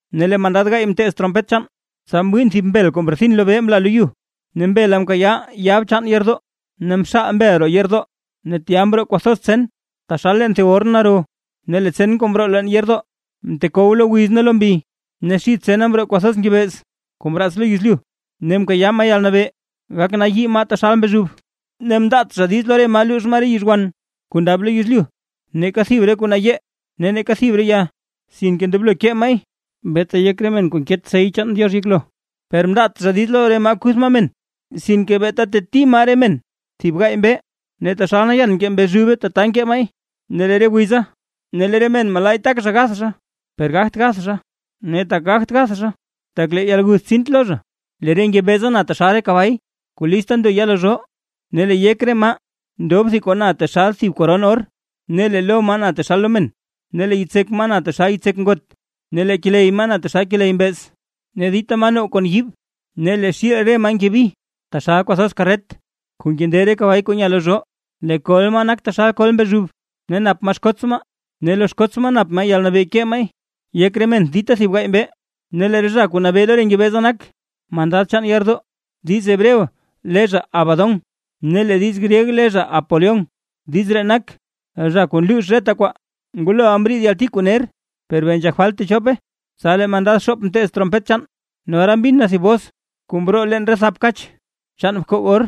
Ne lee mandad gaay mteez trompet chaan, tsa mwiin thib mbel kuu mrethin lobee mla lo yu, ne mbela mkayaa yab chaan yeerdoo. Ne mxaal mbel roo yeerdoo, ne tya mroo kwathoz tsen taxal leen thib orn naro. Ne lee tsen kuu mroo leen yeerdoo mtekow lo wiz ne lo mbi. Ne xid tsena mroo kwathoz ngebeez kuu mraats lo yezlyu; ne mkayaa maa yalnabee gaknayii maa taxal mbezhub. Ne mndaat zha diiz lo re maa luux maa re yizhwan kuu ndab lo yezlyu, neeka thib re kuu nayee ne neeka thib re ya, sinke ndoblo kee maay, beeta yek re men kuu nket sey chaan Diox yeklo. Per mndaat zha diiz lo re maa kuth maa men, sinke beeta teti maa re men thib gaay mbee; ne taxal nayan nkee mbezhube tata nkee maay. Ne lee re wiza lee re men malaay tak zha gath zha, per gagt gath zha; ne tak zha gath zha, tak lee yalguth tsiint lo zha. Lee re ngebeeza na taxal re kabay kuu list ndo ya lo zhoo; ne lee yek re maa ndob thib kuu na taxal thib koron or, ne lee lo maa na taxal lo men. Ne lee yitsek maa na taxal yitsek ngot, ne lee keley maa na taxal keley mbeez. Ne dita maa now kon yiib, ne lee xiil re maa nkebi taxal kwathoz karret kuu nkende re kabay kuu nya lo zhoo. Lee kol maa nak taxal kol mbezhub, ne nap maa xkoots maa. Ne lo xkoots maa nap maa yalnabee kee maay yek re men dita thib gaay mbee. Ne lee zha kuu nabee lo re ngebeeza nak, mandad chaan yeerdoo; diiz hebreo le zha Abadón ne lee diiz gryeg le zha Apolión. (Diiz ree nak: “Zha kuu nluux reta kwaa”.) Nguloʼa mriid yalti kuu ner, per bee nzhak falt techope. Tsa lee mandad xoop mteez trompet chaan, ne ora mbin na thib bos kuu mroo leen re thap kach chaan bkoog or,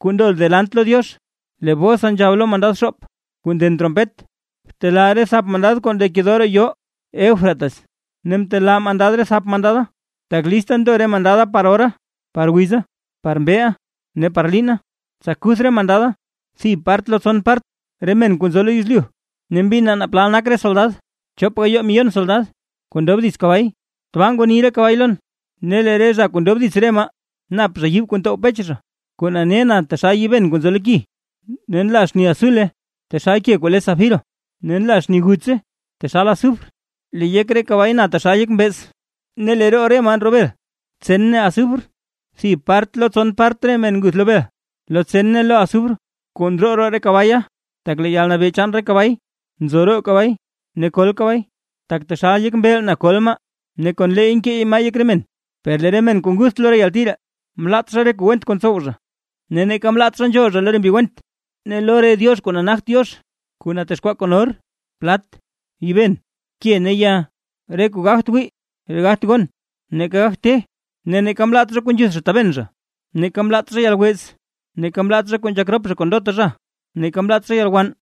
kuu ndo delant lo Diox. Lee bosa nzhab lo mandad xoop, kuu nden trompet: ―Btelaa re thap mandad kuu ndekedoo roo yoo Eufrates. Ne mtelaa mandad re thap mandada, tak lista ndo re mandada par ora, par wiza, par mbeeʼa ne par liina, tsa kuth re mandada thib part lo tson part re men kuu nzo lo yezlyu. Ne mbin naa plal nak re soldad: Chop gayoo miyon soldad kuu ndob dits kabay. Tbaa ngwani re kabay lon, ne lee re zha kuu ndob dits re maa, nap zha yiib kuu ntow pech zha kuu nane na taxal yiiben kuu nzo lo ki, ne nla xni azule taxal ke kuu le safiro ne nla xni gutse taxal azufre. Lee yek re kabay na taxal yek mbeez ne lee roo re maa ndroo bel, tsen ne azufre. Thib part lo tson part re men nguth lo bel, lo tsen ne lo azufre kuu ndroo roo re kabaya. Tak lee yalnabee chaan re kabay nzo roo kabay ne kol kabay; tak taxal yek mbeel na kol maa, ne kon leey nkee maay yek re men. Per lee re men kuu ngutht lo re yalti ree, mlaat zha re kuu went kuu ntsow zha, neeka mlaat zha nzhool zha lo re mbi went, ne lo re diox kuu nagt Diox, kuu natexkwaa kon or, plat, yiiben ke ne ya, re kuu gagt wii, ne gagt gon, neeka gagt te. Ne neeka mlaat zha kuu nzhuth zha taben zha, neeka mlaat zha yalwez, neeka mlaat zha kuu nzhak rop zha kon ndota zha, ne neeka mlaat zha yalwann.